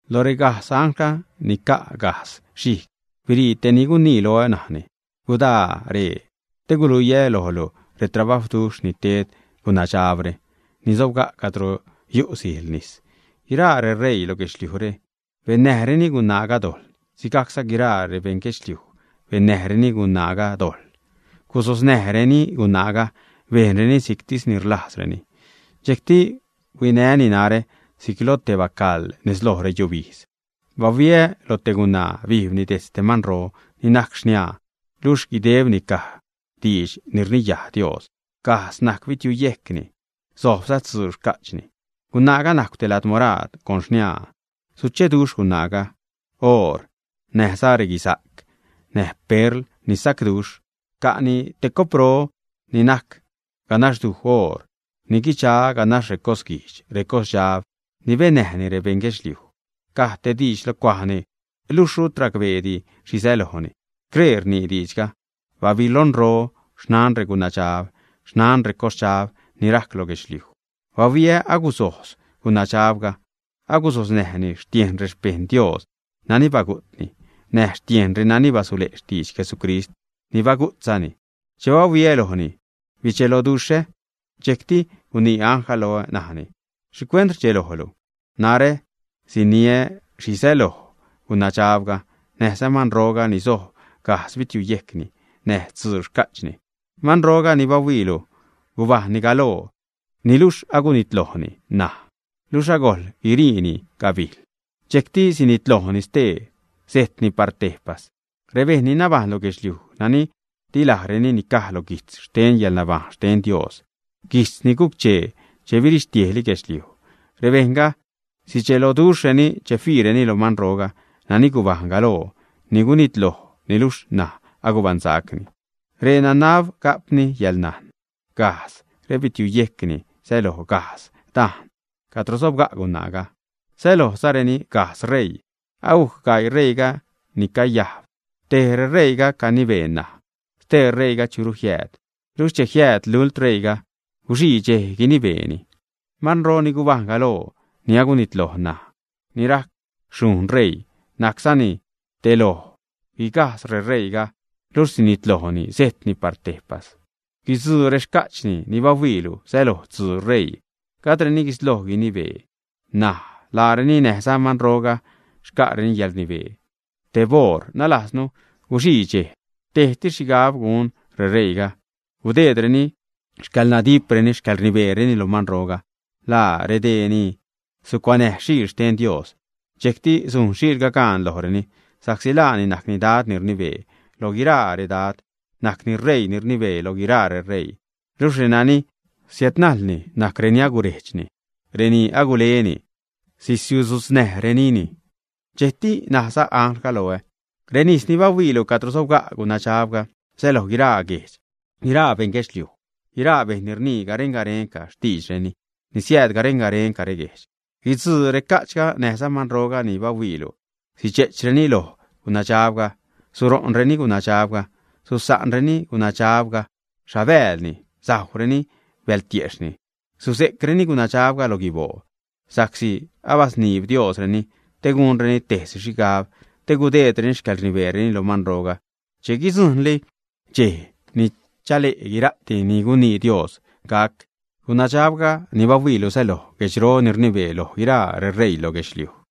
Lo regajdz anglga ni ca' gajdz xhijg birii tej ni gunii loä, najni: ―Gudaa ree te guluiä lojlu retrabajwduxh ni ted gunadxabre ni sobga' cadro yu sijl nis. Guiraa reṟeii lo guedxliujre bennäjreni gunaaga dojḻ, sigajcza guiraa rebeṉ guedxliuj bennäjreni gunaaga dojḻ. Gusosnäjreni gunaaga bejnreni si'ctis ni rlajzreni. Dxejcti huinäni narä si'c lo te bacaḻ nez lo reyubijdz. Bahuiä loj te gunaa, bijbni dejtz te manro ni najc xniaa, luxh guidebni caj diidx ni rniyaj Dios. Gajdz najc bitiuyejcni, sojbza tzuu xca'chni. Gunaaga najcw te lad moraad con xniaa, sucheduxh gunaaga oor, näj reguisa'c, näj perl ni sa'cduxh. Ca'ni te copro ni najc ganaxduj oor ni guidxa ganax recosguijdx, recosdxab ni bennäjni rebeṉ guedxliuj. Caj te diidx lo cuajni, luxh rut racbeedi xhi sälojni. Scree rnii diidxga: “Babilonro, xnan regunadxab, xnan recosdxab ni rajc lo guedxliuj.” Bahuiä agusojz gunadxabga. Agusosnäjni xtiejn rexpejṉ Dios nani bagu'tni, näj xtiejn renani basule' xtidx Jesucrist ni bagu'tzani. Che bahuiä lojni, bidxeloduxhä. Dxejcti gunii anglga loä, najni: ―¿Xhicuent rdxelojlu, ä? Narä siniä xhi säloj gunadxabga, näjza manroga ni sojb gajdz bitiuyejcni näj tzuu xca'chni. Manroga ni bahuiilu gubajṉni galoo, niluxh agunitlojni ṉaj, luxh agojl guiriini gabijl, dxejcti sinitlojni stee, sejtni par tejpas. Rebejṉ ni nabajṉ lo guedxliuj nani di lajreni nicaj lo guijtz xten yäḻnabajṉ xten Dios, guijtz ni guc-chee che birixtiejli guedxliuj, rebejṉga sidxeloduxhreni che fiireni loj manroga nani gubajṉ galoo, ni gunitloj, niluxh naj agubaṉsacni. ’Ree nanab ga'pni yäḻnajn. Gajdz rebitiuyejcni säloj gajdz dajn cadro sobga' gunaaga, sälojzareni gajdz ṟeii. Agujc gaii ṟeiiga ni cayajb. Tej reṟeiiga canibee ṉaj. Stee ṟeiiga churu jiääd. Luxh che jiääd lult ṟeiiga, guxii dxej guinibeeni. Manro ni gubajṉ galoo, ni agunitloj ṉaj, ni'c rac xhujṉ ṟeii, najczani tej loj guigajdz reṟeii, luxh sinitlojni, sejtni par tejpas. ’Guidzuu rexca'chni ni bahuiilu säloj tzuu ṟeii. Gajdreni guisloj guinibee ṉaj. Laareni näjza manroga xca'reni yäḻrnibee teb oṟ, nalajznu guxii dxej. Tejtis xhigab gun reṟeiiga, gudeedreni xcäḻnadipreni, xcäḻrnibeereni lo manroga. Laa redee ni sucuanäj Xiil xten Dios. Dxejcti sujn Xiilga gaan lojreni sa'csi laani najcni Dad ni rnibee loj guiraa redad, najcni Reii ni rnibee lo guiraa reṟeii. Luxh renani siädnajlni najc reni agurejdxni, reni aguleni, sisiudzu'tznäjrenini. Dxejcti najza anglga loä: ―Renis ni bahuiilu cadro sobga' gunadxabga säloj guiraa guejdx, guiraa beṉ guedxliuj, guiraa bejṉ ni rnii garen-garenca xtiidxreni, ni siääd garen-garen reguejdx. Guitzuu reca'chga näjza manroga ni bahuiilu, sidxe'chreni loj gunadxabga, suro'nreni gunadxabga, susa'nreni gunadxabga xhabäälni, sajwreni bältiejxhni, suze'creni gunadxabga lo guiboo. Sa'csi abasniib Diosreni te gunreni tejsi xhigab, te gudeedreni xcäḻrnibeereni lo manroga che guidzujṉli dxej ni chale' guira'ti ni gunii Dios gac. Gunadxabga ni bahuiilu säloj guedxro ni rnibee loj guiraa reṟeii loj guedxliuj.